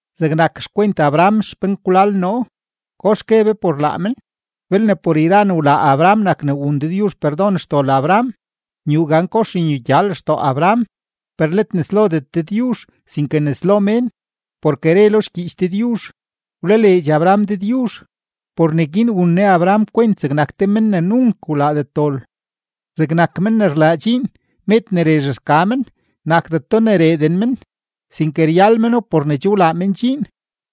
Zegnak xkwent Abraham xpenkwlal noo, ¿kox gue be por laa men? Belne por yra ne wlaa Abraham nak ne wun Dëdyuzh perdon xdol Abraham, nyuu gan kox nyugya lextoo Abraham, per let nes lodet Dëdyuzh, sinke nes lo mén. Porke re lo xgyiich Dëdyuzh: “Wlaleedx Abraham Dëdyuzh; por neguin wun Ne Abraham kwent zegnak te men ne nunk wlaadet dol.” Zegnak men ne rlaa dxiin, med ne rezh rka men, nakdeto ne reeden men, sinke ryal meno por ne che wlaa men dxiin.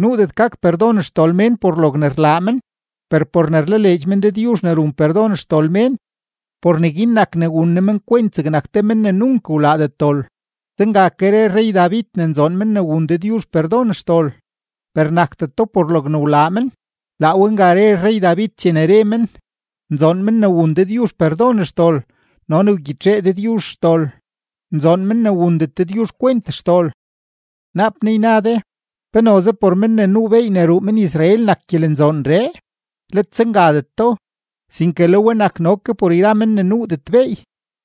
Nuudet gak perdon xdol mén por logne rlaa men, per por ne rlaleedx men Dëdyuzh ne run perdon xdol mén, por neguin nak ne wun Ne men kwent zegnak te men ne nunk wlaadet dol. Zenga ke re rrey-David ne nzoon men ne wun Dëdyuzh perdon xdol, per nakdeto por logne wlaa men, laa we nga re rrey-David chene re men: Nzoon men ne wun Dëdyuzh perdon xdol no ne wgyitxee Dëdyuzh xdol. Nzoon men ne wundet Dëdyuzh kwent xdol. Naap naa yna de: “¿Pe noze por men ne nuu beey ne ruu men-Israel nak gyelenzoonree?” ¡Let zengadeto! Sinke le we nak no ke por men ne nuudet beey.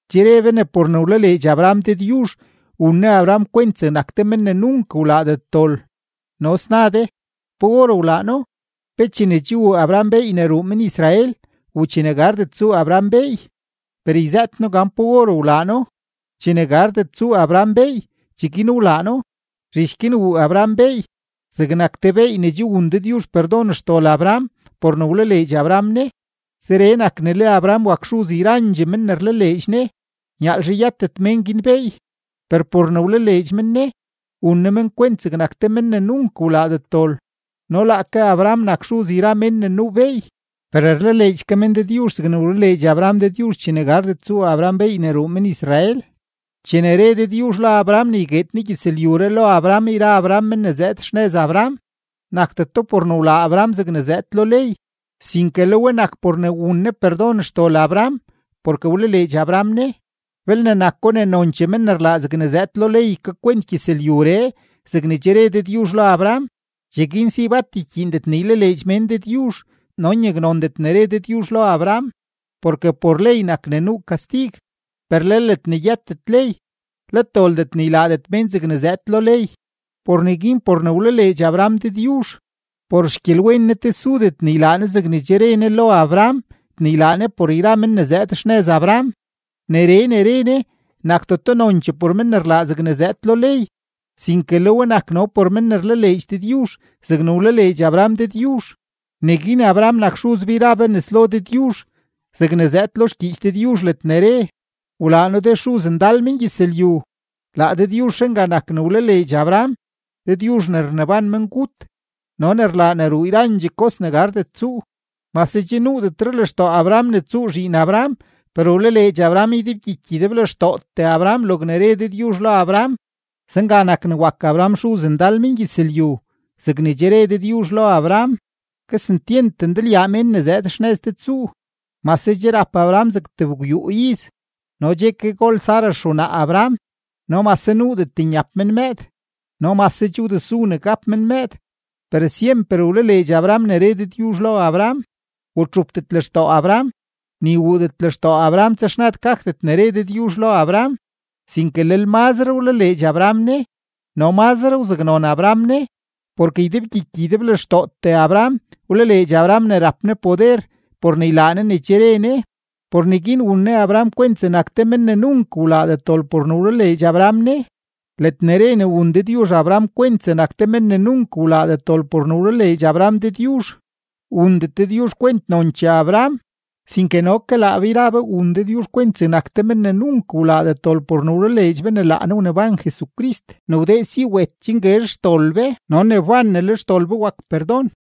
Che re be ne por ne wlaleedx Abraham Dëdyuzh, wun Ne Abraham kwent zegnak te men ne nunk wlaadet dol. No sna de: “¿Pa or wlaa No? ¿Pe chene che wuu Abraham beey ne ruu men-Israel u chene gardet tsuu Abraham beey?” Per yzëët noo gan pa or wlaa No: chene gardet tsuu Abraham beey, cheguin wlaa No. Zhich guin wuu Abraham beey zegnak te beey ne che wun Dëdyuzh perdon xdol Abraham por ne wlaleedx Abraham Ne. Zeree nak ne le Abraham wak xuz yrandxee men ne rlaleedx Ne, nyaalzhe yëtet mén guin beey, per por ne rlaleedx men Ne, wun Ne men kwent zegnak te men ne nunk wlaadet dol. No laake Abraham nak xuz yra mén ne nuu beey, per rlaleedx ke men Dëdyuzh zegne wlaleedx Abraham Dëdyuzh chene gardet tsuu Abraham beey ne ruu men-Israel. Chene re Dëdyuzh lo Abraham ne ygueed Ne gyëzlyuree lo Abraham yra Abraham men ne zëëd xnëz Abraham, nakdeto por ne wlaa Abraham zegne zëëd lo ley, sinke le we nak por ne wun Ne perdon xdol Abraham porke wlaleedx Abraham Ne. Belne nako ne nonchee men ne rlaa zegne zëëd lo ley ykakwent gyëzlyuree zegne che re Dëdyuzh lo Abraham, cheguin si bat ykyiindet ne ylaleedx mén Dëdyuzh no nyaknondet ne re Dëdyuzh lo Abraham. Porke por ley nak ne nuu kastig, per le ledne yëtet ley, let doldet ne ylaadet mén zegne zëëd lo ley. Por neguin por ne wlaleedx Abraham Dëdyuzh, por xgyelwen Ne tesudet ne ylaa Ne zegne che re Ne lo Abraham ne ylaa Ne por yra men ne zëëd xnëz Abraham. Neree ne re Ne nakdeto nonchee por men ne rlaa zegne zëëd lo ley, sinke le we nak no por men ne rlaleedx Dëdyuzh zegne wlaleedx Abraham Dëdyuzh; neguin Abraham nak xuz be yra be nes lo Dëdyuzh, zegne zëëd lo xgyiich Dëdyuzh ledne re: “Wlaa noo de xuz ndal mengyëzlyu.” Laa Dëdyuzhree nga nak ne wlaleedx Abraham, Dëdyuzh ne rneban mengut no ne rlaa ne ruu yra kos ne gardet tsuu. Mase che nuudetre lextoo Abraham ne tsuu zhiin Abraham, per wlaleedx Abraham ydebgyiky ydeblextootee Abraham logne re Dëdyuzh lo Abraham, zenga nak ne wak Abraham “xuz ndal mengyëzlyu”, zegne che re Dëdyuzh lo Abraham: “Kesentyent ndalyaa mén ne zëëd xnëz de tsuu.” Mase che rap Abraham zeg tebgwyuu iz no che ke gol Sara xewnaa Abraham no mase nuudet nyap men mëëd no mase che wdesu ne gap men mëëd, per syemper wlaleedx Abraham ne re Dëdyuzh lo Abraham. Wtxupdet lextoo Abraham, ni wuudet lextoo Abraham texnad gakdet ne re Dëdyuzh lo Abraham, sinke lel mazre wlaleedx Abraham Ne no mazre wzaknon Abraham Ne, porke ydebgyiky ydeblextootee Abraham wlaleedx Abraham ne rap Ne poder por ne ylaa Ne ne che re Ne. Por neguin wun Ne Abraham kwent zegnak te men ne nunk wlaadet dol por ne wlaleedx Abraham Ne. Ledne re ne wun Dëdyuzh Abraham kwent zegnak te men ne nunk wlaadet dol por ne wlaleedx Abraham Dëdyuzh, wundet Dëdyuzh kwent nonchee Abraham, sinke no ke laa be yra be wun Dëdyuzh kwent zegnak te men ne nunk wlaadet dol por ne wlaleedx be ne laa Ne wneban Jesucrist ne wdee si wet chen guezh xdol be no ne wban ne le xdol be wak perdon.